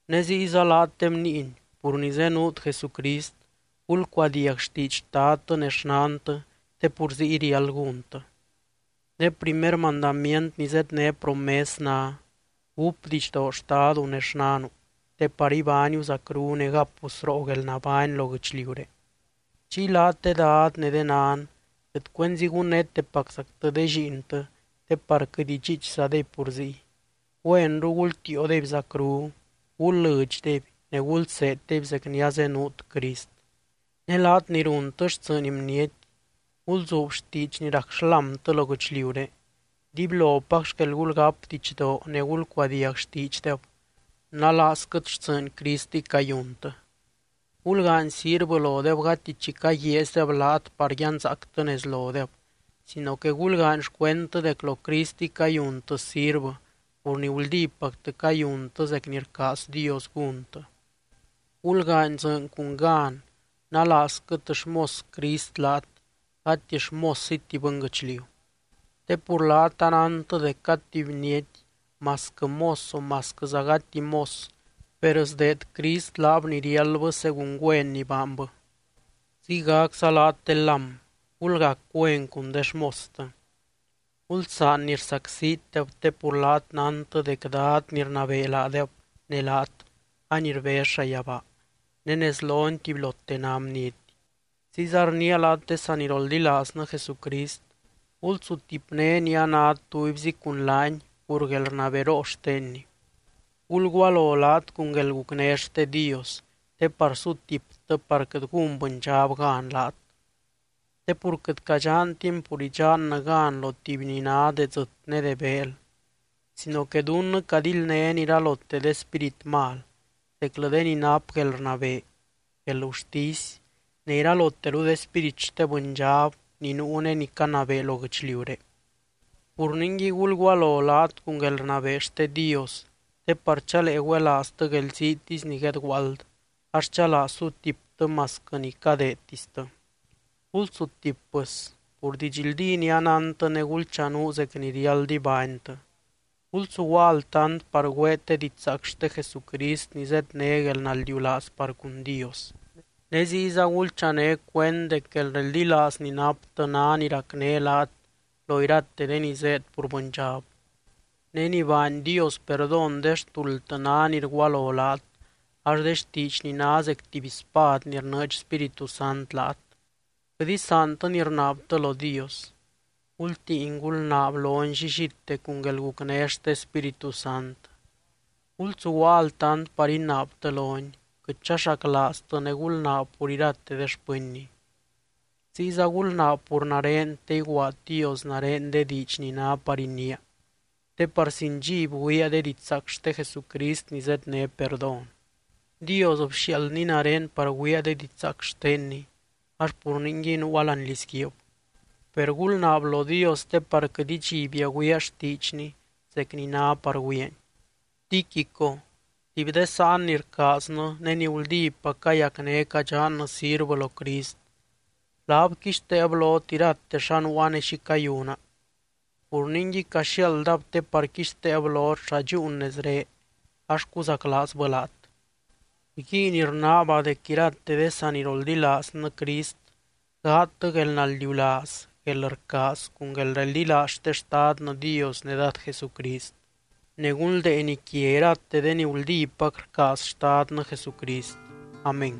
Ne ziyza laat de bniiny, pur ni zenuut Jesucrist, gulcuadiag xtiidx xtadtɨ ne xnantɨ te pur ziy riáld gúntɨ. Ne primer mandamient ni zedné promes ná: “Gúp didxdoo xtadu ne xnanu, te par ibániu zacru ne gapu sroo guelnabány lo guɨchliuré.” Chiy laat de dad ne de nan, quɨt cuenzi gunnétepaczactɨ de lliintɨ te par quɨt idxiichzadeby pur ziy. Güenru gultiiodeby zacru, gul lɨdxdeby ne gulseeddeby zec ni azenuut Crist. Ne laat ni runtɨ xtsɨɨny bniety, gulzuub xtiidx ni rac xlámtɨ lo guɨchliuré. Dibylopac xquel gulgáp didxdoo ne gulcuadiag xtiidxdeb, nalaazquɨt xtsɨɨny Cristiy cayuntɨ. Gulgaany sirvɨ lodeb gati chi caguiaazydeb laat par yanzaactɨ nez lodeb, sino que gulgaany xcuendtɨ dec lo Cristiy cayuntɨ sirvɨ pur ni guldípactɨ cayuntɨ zec ni rcaaz Dios gúntɨ. Gulgaany dzɨɨny cun gan, nalaazquɨt xmos Crist laat gati xmósziti bɨnguɨchliu. Te pur laat anántɨ dec cad tuby bniety, masquɨ mos o masquɨza gati mos per sdeed Crist laab ni riáldbɨ según güen ni baanbɨ. Ziygacza laat de lám, gulgac güen cun de xmostɨ. Gulsaan ni rsacsitdeb te pur laat nántɨ dec Dad ni rnabee laadeb ne laat any rbez llayabaa, ne nez lony tubylote ná bniety. Ziyza rniia laat de saniroldilaaznɨ Jesucrist, gulsutipné ni anát tubyzi cun laany pur guelrnaberoo xtenny. Gulgualo laat cun guelgucné xte Dios, te par sutiptɨ par quɨt gún bɨndxab gan laat. Te pur quɨt cadxantin pur idxannɨ gan lo tuby ni ná de dzɨt ne de beel sino que dunnɨ cadildnén iralote de spírit mal, zeclɨ de ni nap guelrnabee, guelgurtisy ne iraloteru de spírit xte bɨndxab ni nuu ne ni canabee lo guɨchliuré. Pur ningui, gulgualo laat cun guelrnabee xte Dios te par chalee güelaaztɨ guelziitisy ni guedguaald ax chalaa sutiptɨ masquɨ ni cadeedtistɨ. Gulsutip pɨs, pur didxldí ni anántɨ ne gulchanuu zec ni riáld ibánytɨ. Gulsuguaa altant par güeet de didxzaac xte Jesucrist ni zedné guelnaldiulaaz par cun Dios. Ne ziyza gulchané cuend dec guelreldilaaz ni naptɨ ná ni racné laat lo irate de ni zéed pur bɨndxab. Ne ni baany Dios perdón de xtuldtɨ ná ni rgualo laat ax de xtiidxny ná zec tuby spad ni rnɨɨdx Spíritu Sant laat. Quɨt isaantɨ ni rnaabtɨ lo Dios. Gultiin, gulnaab lony llillite cun guelgucné xte Spíritu Sant. Gulsuguaa altant par inaabtɨ lony, quɨt chaxaclaaztɨ ne gulnaab pur irate de xpɨnny. Ziyza gulnaab pur nare te iguaad Dios nare de diidx ni ná par iniia, te par sin dxiby güiaa de didxzaac xte Jesucrist ni zedné perdón. Dios bxiaaldny nare par güiaa de didxzaac xtenny, ax pur ningui nuua láani lizguiib. Per gulnaab lo Dios te par quɨt idxibia güiaa xtiidxny zec ni ná par güiaany. Tíquico tuby de sáan ni rcaaznɨ ne ni guldípac cayacné cadxannɨ sirvɨ lo Crist, laab quixteeb lot irate xa nuua ne xi cayuna. Pur ningui, caxiaaldab te par quixteeb lot xa dxúun nezré ax cuzaclaazbɨ laat. Rguiin rnaaba dec irate de saniroldilaaznɨ Crist gaadtɨ guelnaldiulaaz, guelrcaaz cun guelreldilaaz xte Xtadnɨ Dios ne Dad Jesucrist. Ne gunldeeny quia irate de ni guldípac rcaaz Xtadnɨ Jesucrist. Amén.